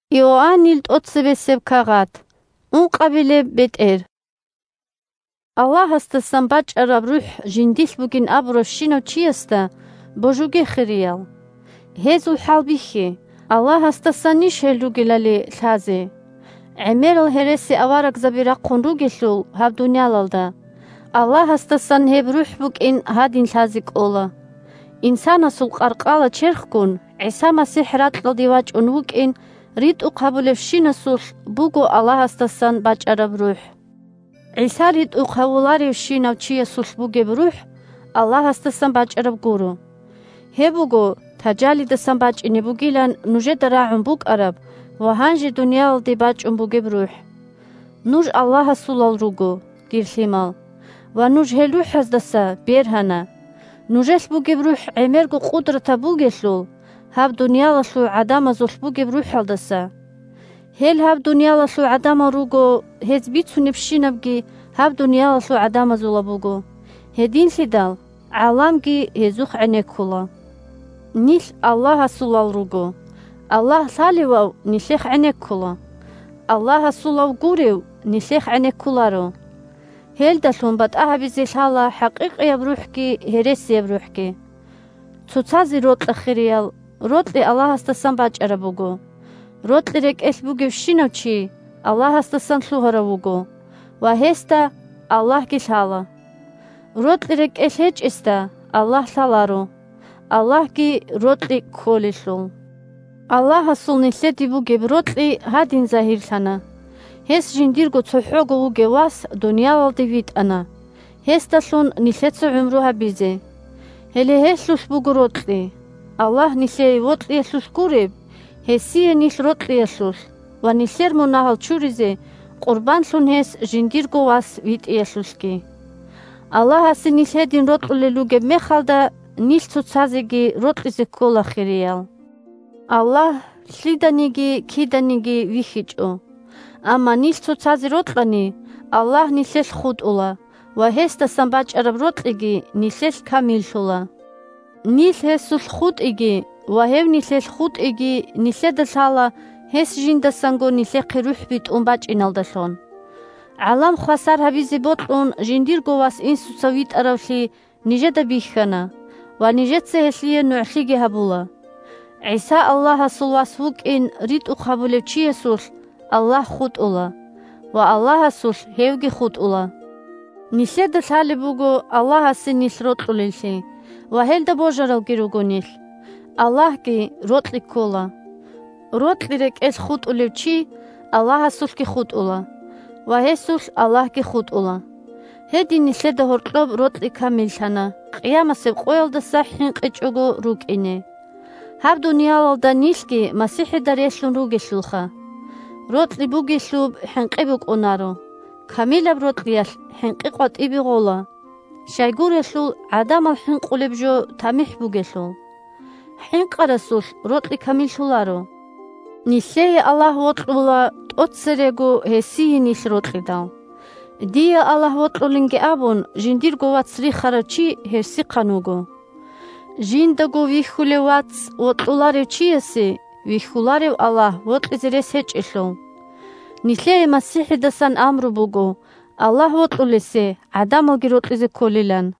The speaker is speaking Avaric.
бетӀер РухӀазул хӀалбихьулеб куц 1Аллагьасдасан бачӀараб рухӀ жиндилъ бугин абуравщинав чиясда божуге, хириял. Гьезул хӀалбихье, Аллагьасдасанищ гьел ругелали лъазе. ГӀемерал гьересиаварагзаби рахъун ругелъул гьаб дуниялалда. 2Аллагьасдасан гьеб рухӀ букӀин гьадин лъазе кӀола: инсанасул къаркъала-черхгун ГӀиса МасихӀ ракьалде вачӀун вукӀин ритӀухъ гьабулевщинасулъ буго Аллагьасдасан бачӀараб рухӀ. 3ГӀиса ритӀухъ гьавуларевщинав чиясулъ бугеб рухӀ Аллагьасдасан бачӀараб гуро. Гьеб буго Тажалидасан бачӀине бугилан нужеда рагӀун букӀараб ва гьанже дуниялалде бачӀун бугеб рухӀ. 4Нуж Аллагьасулал руго, дир лъимал, ва нуж гьел рухӀаздаса бергьана. Нужелъ бугеб рухӀ гӀемерго къудратаб бугелъул гьаб дуниялалъул гӀадамазулъ бугеб рухӀалдаса. Гьел гьаб дуниялалъул гӀадамал руго, гьез бицунебщинабги гьаб дуниялалъул гӀадамазулаб буго, гьединлъидал гӀаламги гьезухъ гӀенеккула. Нилъ Аллагьасулал руго, Аллагь лъалевав нилъехъ гӀенеккула, Аллагьасулав гурев нилъехъ гӀенеккуларо. Гьелдалъун батӀа гьабизе лъала хӀакъикъияб рухӀги гьересияб рухӀги. Цоцазе рокьа, хириял, рокьи Аллагьасдасан бачӀараб буго, рокьи рекӀелъ бугевщинав чи Аллагьасдасан лъугьарав вуго, ва гьесда Аллагьги лъала. Рокьи рекӀелъ гьечӀесда Аллагь лъаларо, Аллагьги рокьи кколелъул. Аллагьасул нилъеде бугеб рокьи гьадин загьирлъана: гьес жиндирго цохӀого вугев Вас дуниялалде витӀана гьесдалъун нилъеца гӀумру гьабизе. Гьеле гьелъулъ буго рокьи – Аллагь нилъее вокьиялъулъ гуреб, гьесие нилъ рокьиялъулъ ва нилъер мунагьал чуризе къурбанлъун гьес жиндирго Вас витӀиялъулъги. Аллагьасе нилъ гьедин рокьулел ругеб мехалда, нилъ цоцазеги рокьизе ккола, хириял. Аллагь лъиданиги киданиги вихьичӀо, амма нилъ цоцазе рокьани, Аллагь нилъелъ хутӀула ва гьесдасан бачӀараб рокьиги нилъелъ камиллъула. Нилъ гьесулъ хутӀиги ва гьев нилъелъ хутӀиги нилъеда лъала гьес жиндасанго нилъехъе РухӀ битӀун бачӀиналдалъун. ГӀалам хвасар гьабизе бокьун, жиндирго Вас Инсуца витӀаравлъи нижеда бихьана ва нижеца гьелъие нугӀлъиги гьабула. ГӀиса Аллагьасул Вас вукӀин ритӀухъ гьабулев чиясулъ Аллагь хутӀула ва Аллагьасулъ гьевги хутӀула. Нилъеда лъалеб буго Аллагьасе нилъ рокьулеллъи ва гьелда божаралги руго нилъ. Аллагьги рокьи ккола, рокьи рекӀелъ хутӀулев чи Аллагьасулъги хутӀула, ва гьесулъ Аллагьги хутӀула. Гьедин нилъеда гьоркьоб рокьи камиллъана, къиямасеб къоялдаса хӀинкъичӀого рукӀине. Гьаб дуниялалда нилъги МасихӀида релълъун ругелъулха! Рокьи бугелъуб хӀинкъи букӀунаро, камилаб рокьиялъ хӀинкъи къватӀибе гъола, щайгурелъул гӀадамал хӀинкъулеб жо тамихӀ бугелъул. ХӀинкъарасулъ рокьи камиллъуларо. Нилъее Аллагь вокьула, тӀоцерего гьесие нилъ рокьидал. Дие Аллагь вокьулинги абун, жиндирго вац рихарав чи гьерсихъан вуго. Жиндаго вихьулев вац вокьуларев чиясе вихьуларев Аллагь вокьизе рес гьечӀелъул. Нилъее МасихӀидасан амру буго Аллагь вокьулесе гӀадамалги рокьизе кколилан.